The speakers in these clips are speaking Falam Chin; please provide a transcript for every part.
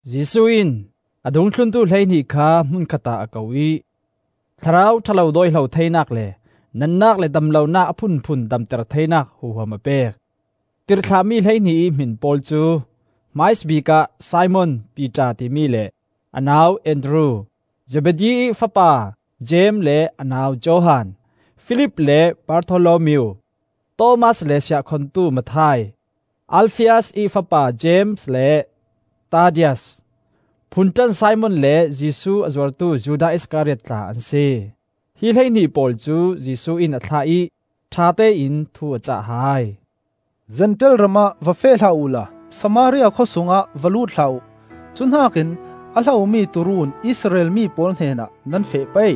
Jesuh in a dungthluntu hleihnih kha hmun khatah a ko ih thlarau ṭha lo dawihlo theinak le natnak le dam lonak a phunphun damter theinak huham a pek. Tirhthlahmi hleihnih ih hmin pawl cu, hmaisabik ah Simon (Piter timi) le a nau Andru; Zebedi ih fapa Jeim le a nau Johan; Filip le Bartholomeo; Thomas le siahkhongtu Matthai; Alfias ih fapa Jeim le Tadias; Phunṭan Simon le Jesuh a zuartu Judas Iskariot tla an si. Hi hleihnih pawl cu Jesuh in a thlah ih ṭhatein thu a cah hai. “Zentail ram ah va feh hlah uhla Samaria khawsung ah va lut hlah uh. Cuhnakin a hlomi tuu run Israel mi pawl hnenah nan feh pei.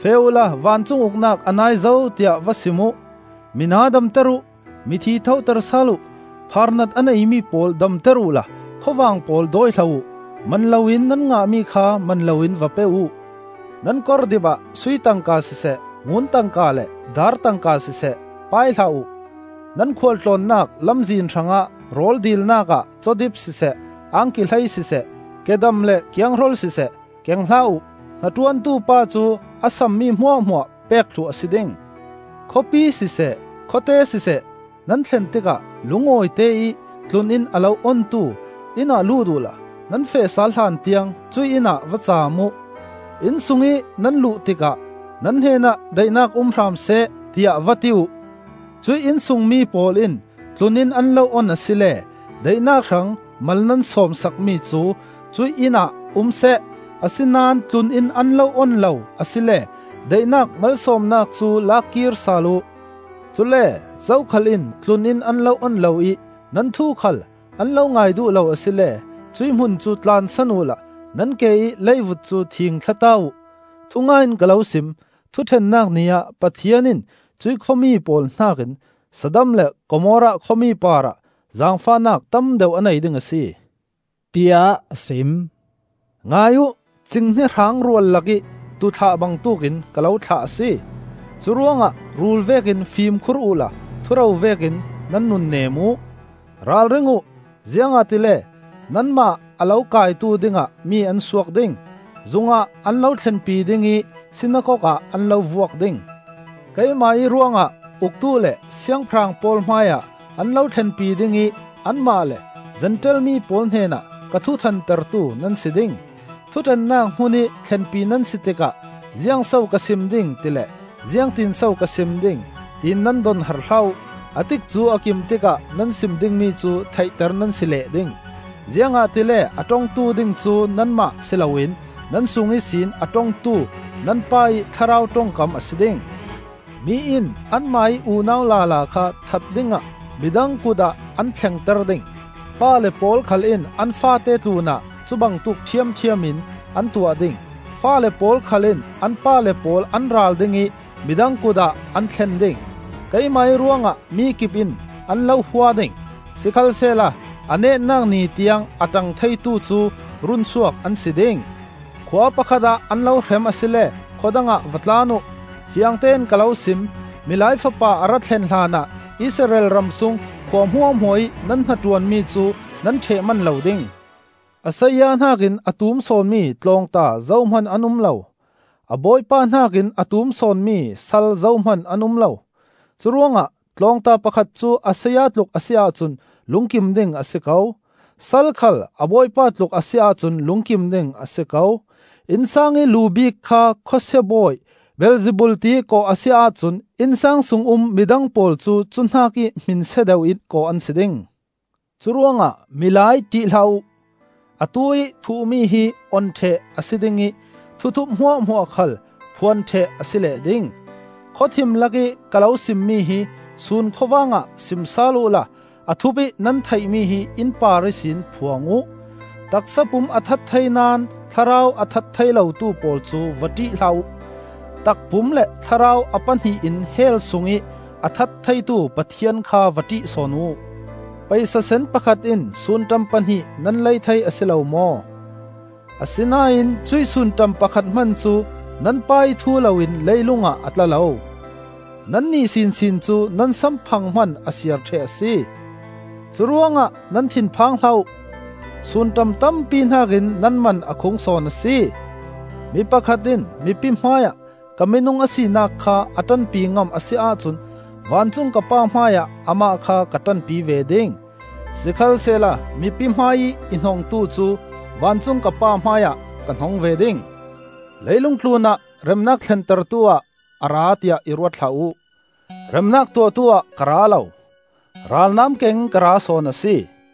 Feh uh la, ‘Vancung Uknak a nai zo,’ tiah va sim uh. Mina damter uh, mithi thoter sal uh, phaarnat a neimi pawl damter uhla khuavang pawl dawihlo uh. Man loin nan ngahmi kha man loin va pe uh. Nan kordip ah sui tangka siseh, ngun tangka le dar tangka siseh, pai hlah uh. Nan khualtlawnnak lamzin hrangah rawl dilnak ah cawdip siseh, angki hlei siseh, kedam le kianghrol siseh, keng hlah uh. Hnaṭuantu pa cu a sammi hmuahhmuah pek thluh a si ding. “Khawpi siseh, khawte siseh nan thlen tikah lungawite ih tlun-inn a lo ontu inn ah lut uhla nan feh sal hlan tiang cuih inn ah va cam uh. Inn sungih nan luh tikah ‘Nan hnenah daihnak um hram seh,’ tiah va ti uh. Cuih inn sung mi pawl in tlun-inn an lo on asile daihnak hrang mal nan sawm sakmi cu cuih inn ah umseh. Asinain tlun-inn an lo on lo asile daihnak malsawmnak cu la kir sal uh. Cule zokhal in tlun-inn an lo on lo ih nan thu khal an ngai duh lo asile cuih hmun cu tlansan uhla nan ke ih leivut cu thingthlata uh. Thungai in ka lo sim: thuṭhennak Ni ah Pathian in cuih khua mi pawl hnakin Sodom le Gomorrah khua mi parah zaangfahnak tam deuh a nei ding a si,” tiah a sim. “Ngai uh! Cinghnia hraang rual lakih tuu thlah bangtuk in ka lo thlah a si. Curuangah rul vekin fimkhur uhla thuro vekin nan nun nem uh. Ralring uh, ziangahtile nanmah a lo kaitu dingah mi an suak ding; zungah an lo thlenpi ding ih sinakok ah an lo vuak ding. Keimah ih ruangah uktu le siangpahrang pawl hmaiah an lo thlenpi ding ih anmah le Zentail mi pawl hnenah ka thu thantertu nan si ding. Thuṭhennak hmunih thlenpi nan si tikah ziangso ka sim ding ti le ziangtinso ka sim ding, tiin nan donhar hlah uh. A tikcu a kim tikah nan sim dingmi cu theihter nan si leh ding. Ziangahtile a ṭongtu ding cu nanmah si loin nan sung ihsin a ṭongtu nan Pa ih Thlarau ṭongkam a si ding. “Mi in anmah ih unau lala kha that dingah midang kut ah an thlengter ding. Pale pawl khal in an faate tlunah cu bangtuk ṭhiamṭhiam in an tuah ding. Faale pawl khal in an pale pawl an ral ding ih midang kut ah an thlen ding. Keimah ruangah mikip in an lo hua ding. Sikhalsehla a netnak ni tiang a ṭang theitu cu runsuak an si ding. Khua pakhat ah an lo hrem asile khua dangah va tlan uh. Fiangtein ka lo sim: Milai Fapa a ra thlen hlanah Israel ram sung khua hmuahhmuahih nan hnaṭuanmi cu nan ṭheh man lo ding. “A saya hnakin a tum sawnmi tlawngta zohman an um lo. A bawipa hnakin a tum sawnmi sal zohman an um lo. Curuangah tlawngta pakhat cu a saya tluk a si ahcun lungkim ding a si ko; sal khal a bawipa tluk a si ahcun lungkim ding a si ko. Innsang ih lu bik kha khawsia bawi Beelzebul tiih kawh a si ahcun innsang sung um midang pawl cu cuhnakih hmin sia deuh in kawh an si ding. “Curuangah milai ṭih hlah uh. Atuih thuh-mi hi on ṭheh a si ding ih thuthup hmuahhmuah khal phuan ṭheh a si leh ding. Khawthim lakih ka lo simmi hi sun khawvang ah sim sal uhla a thup ih nan theihmi hi innpar ihsin phuang uh. Taksapum a that thei naón thlarau a that thei lotu pawl cu va ṭih hlah uh. Takpum le thlarau a pahnih in hell sungih a that theitu Pathian kha va ṭih sawn uh. Paisasen pakhat in sunṭam pahnih nan lei thei a si lo maw? Asinain cuih sunṭam pakhat hman cu nan Pa ih thu loin leilung ah a tla lo. Nannih sinsin cu nan samphang hman a siar ṭheh a si. Curuangah nan thin phang hlah uh. Sunṭam tampi hnakin nan man a khung sawn a si. “Mi pakhat in mipi hmaiah ka minung a sinak kha a ṭanpi ngam a si ahcun vancung ka Pa hmaiah amah kha ka ṭanpi ve ding. Sikhalsehla mipi hmaiih i hnongtu cu vancung ka Pa hmaiah ka hnong ve ding. “Leilung tlunah remnak thlentertu ah a ra tiah i ruat hlah uh. Remnak tuahtu ah ka ra lo, ralnam kengin ka ra sawn a si.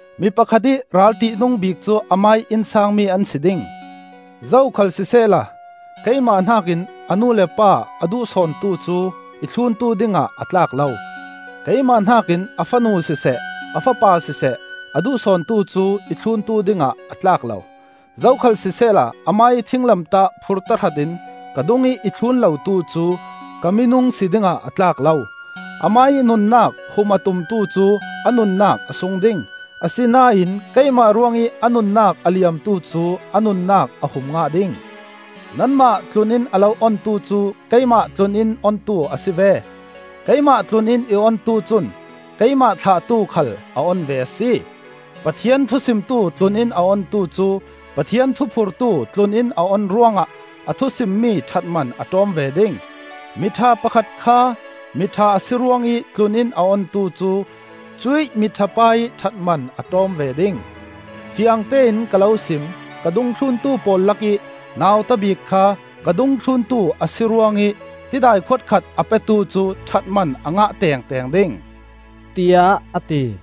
Mi pakhat ih ral ṭihnung bik cu amah ih innsang mi an si ding. “Zokhal sisehla, keimah hnakin a nu le a pa a duh sawntu cu i thluntu dingah a tlak lo. Keimah hnakin a fanu siseh, a fapa siseh, a duh sawntu cu i thluntu dingah a tlak lo. Zokhal sisehla amah ih thinglamtah phur tahratin ka dungih i thlun lotu cu ka minung si dingah a tlak lo. Amah ih nunnak hum a tumtu cu a nunnak a sung ding, asinain keimah ruangih a nunnak a liamtu cu a nunnak a hum ngah ding. “Nanmah tlun-inn a lo ontu cu keimah tlun-inn ontu a si ve; keimah tlun-inn i ontu cun keimah thlahtu khal a on ve a si. Pathian thusimtu tlun-inn a ontu cu Pathian thuphurtu tlun-inn a on ruangah a thusimmi ṭhatman a ṭawm ve ding. Miṭha pakhat kha mi ṭha a si ruangih tlun-inn a ontu cu cuih miṭhapa ih ṭhatman a ṭawm ve ding. Fiangte in ka lo sim: ka dungthluntu pawl lakih nauta bik kha ka dungthluntu a si ruangih tidai khuat khat a petu cu ṭhatman a ngah tengteng ding,” tiah a ti.